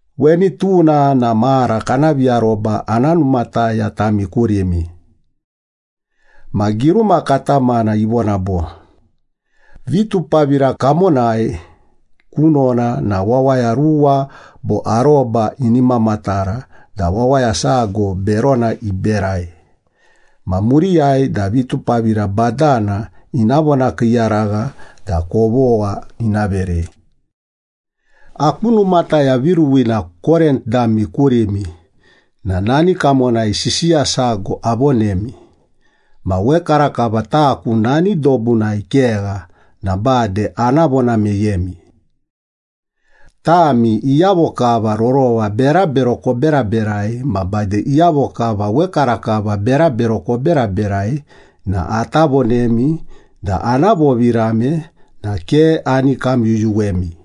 Weni tuna na mara kana viaroba ana numataya tami kurimi. Ma giruma katamana ivona bo, “Vitupavira kamonai kunona na wawaya ruwa bo aroba ini mamatara da wawaya sago berona iberai ma muriyai da vitupavira badana ina vonakiiyaragha da kovogha ina verei.” Aku numataya viruwina Korint dami kurimi na nani kamonai sisiya sago avonemi, ma wekarakava taku nani dobunai kegha na bade ana vona meyemi. Tami iyavo kava rorova berabero koberaberai ma bade iyavo kava wekarakava berabero koberaberai na ata vonemi da ana vovirame na ke ani kamyuyuwemi.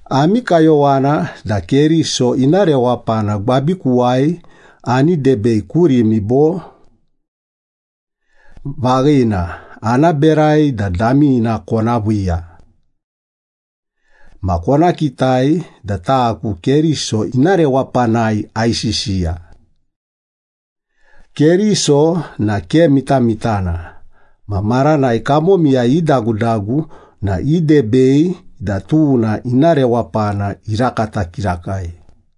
Ami kayowana da Keriso ina rewapana gwabikuwai ani debei kurimi bo? Vaghina, ana berai da damina kona viiya. Ma kona kitai da taku Keriso ina rewapanai aisisiya. Keriso na ke mitamitana, ma maranai kamomiyai idagudagu na idebei da tuna ina rewapana irakata kirakai.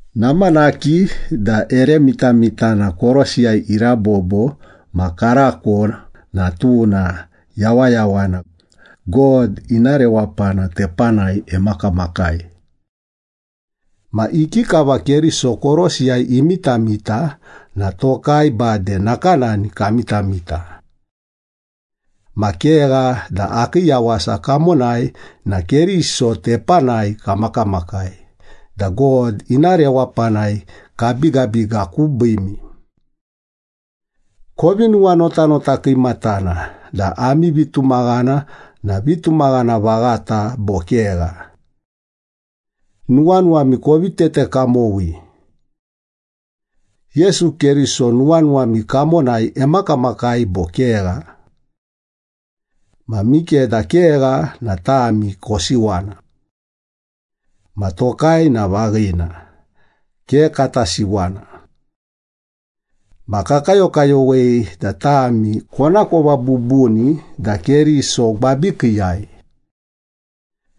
Namanaki da ere mitamitana korosiyai irabobo ma karako na tuna yawayawana, God ina rewapana tepanai emakamakai. Ma ikikava Keriso korosiyai imitamita na tokai bade nakanani kamitamita. Ma kegha da akii yawasa kamonai na Keriso tepanai kamakamakai da God ina rewapanai kabigabiga kubiimi. Kovi nuwanotanota kiimatana da ami vitumaghana na vitumaghana vaghata bo kegha. Nuwanuwami kovi tete kamowi. Yesu Keriso nuwanuwami kamonai emakamakai bo kegha? Ma mikeda kegha na tami kosiwana. Ma tokai na vaghina, ke kata siwana. Ma kakayokayowei da tami konakova bubuni da Keriso gwabikiiyai.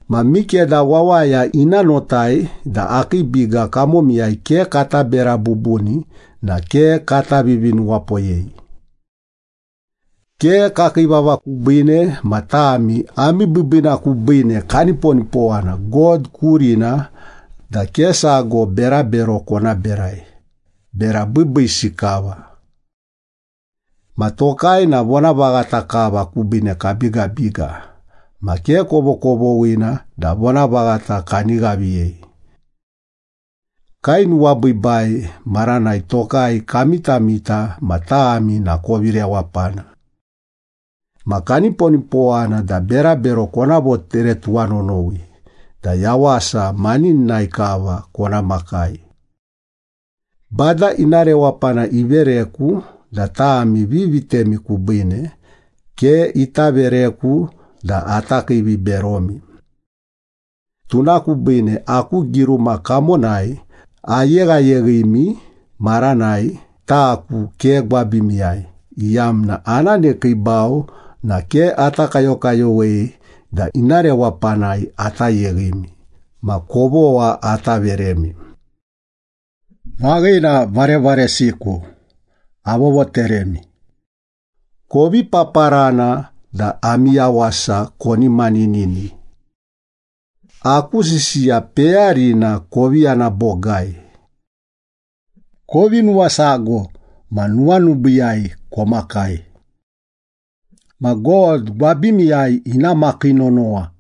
Ma mikeda wawaya ina notai da akii biga kamomiyai ke kata bera bubuni na ke kata vivinuwapoyei. Ke kakii vava kubiine ma tami ami biibiina kubiine kaniponipowana God kurina da ke sago berabero kona berai, bera biibiisi kava. Ma tokai na vonavaghata kava kubiine kabigabiga, ma ke kovokovoghina da vonavaghata kani ghaviyei. Kainuwabiibai maranai tokai kamitamita ma tami na kovi rewapana. Ma kaniponipowana da berabero kona votere tuwanonowi da yawasa manininai kava kona makai. Bada ina rewapana ivereku da tami vivitemi kubiine, ke ita vereku da ata kiiviberomi. Tuna kubiine aku giruma kamonai ayeghayeghimi maranai taku ke gwabimiyai, iyamna ana nekiibau na ke ata kayokayowei da ina rewapanai ata yeghimi ma kovogha ata veremi. Vaghina, varevaresiku, avovoteremi. Kovi paparana da ami yawasa koni maninini. Aku sisiya peyarina kovi yana bogai. Kovi nuwasago ma nuwanubiiyai komakai. Ma God gwabimiyai ina makii nonowa.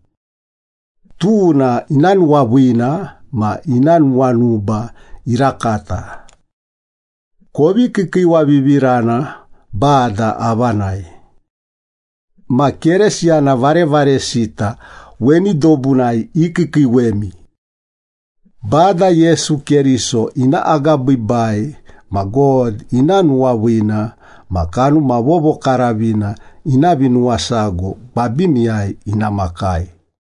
Tuna ina nuwaviina ma ina nuwanuba irakata. Kovi kiikiiwavivirana Bada avanai. Ma Keresiyana varevaresita weni dobunai ikiikiiwemi. Bada Yesu Keriso ina agabiibai ma God ina nuwaviina ma Kanuma Vovokaravina ina vinuwasago gwabimiyai ina makai.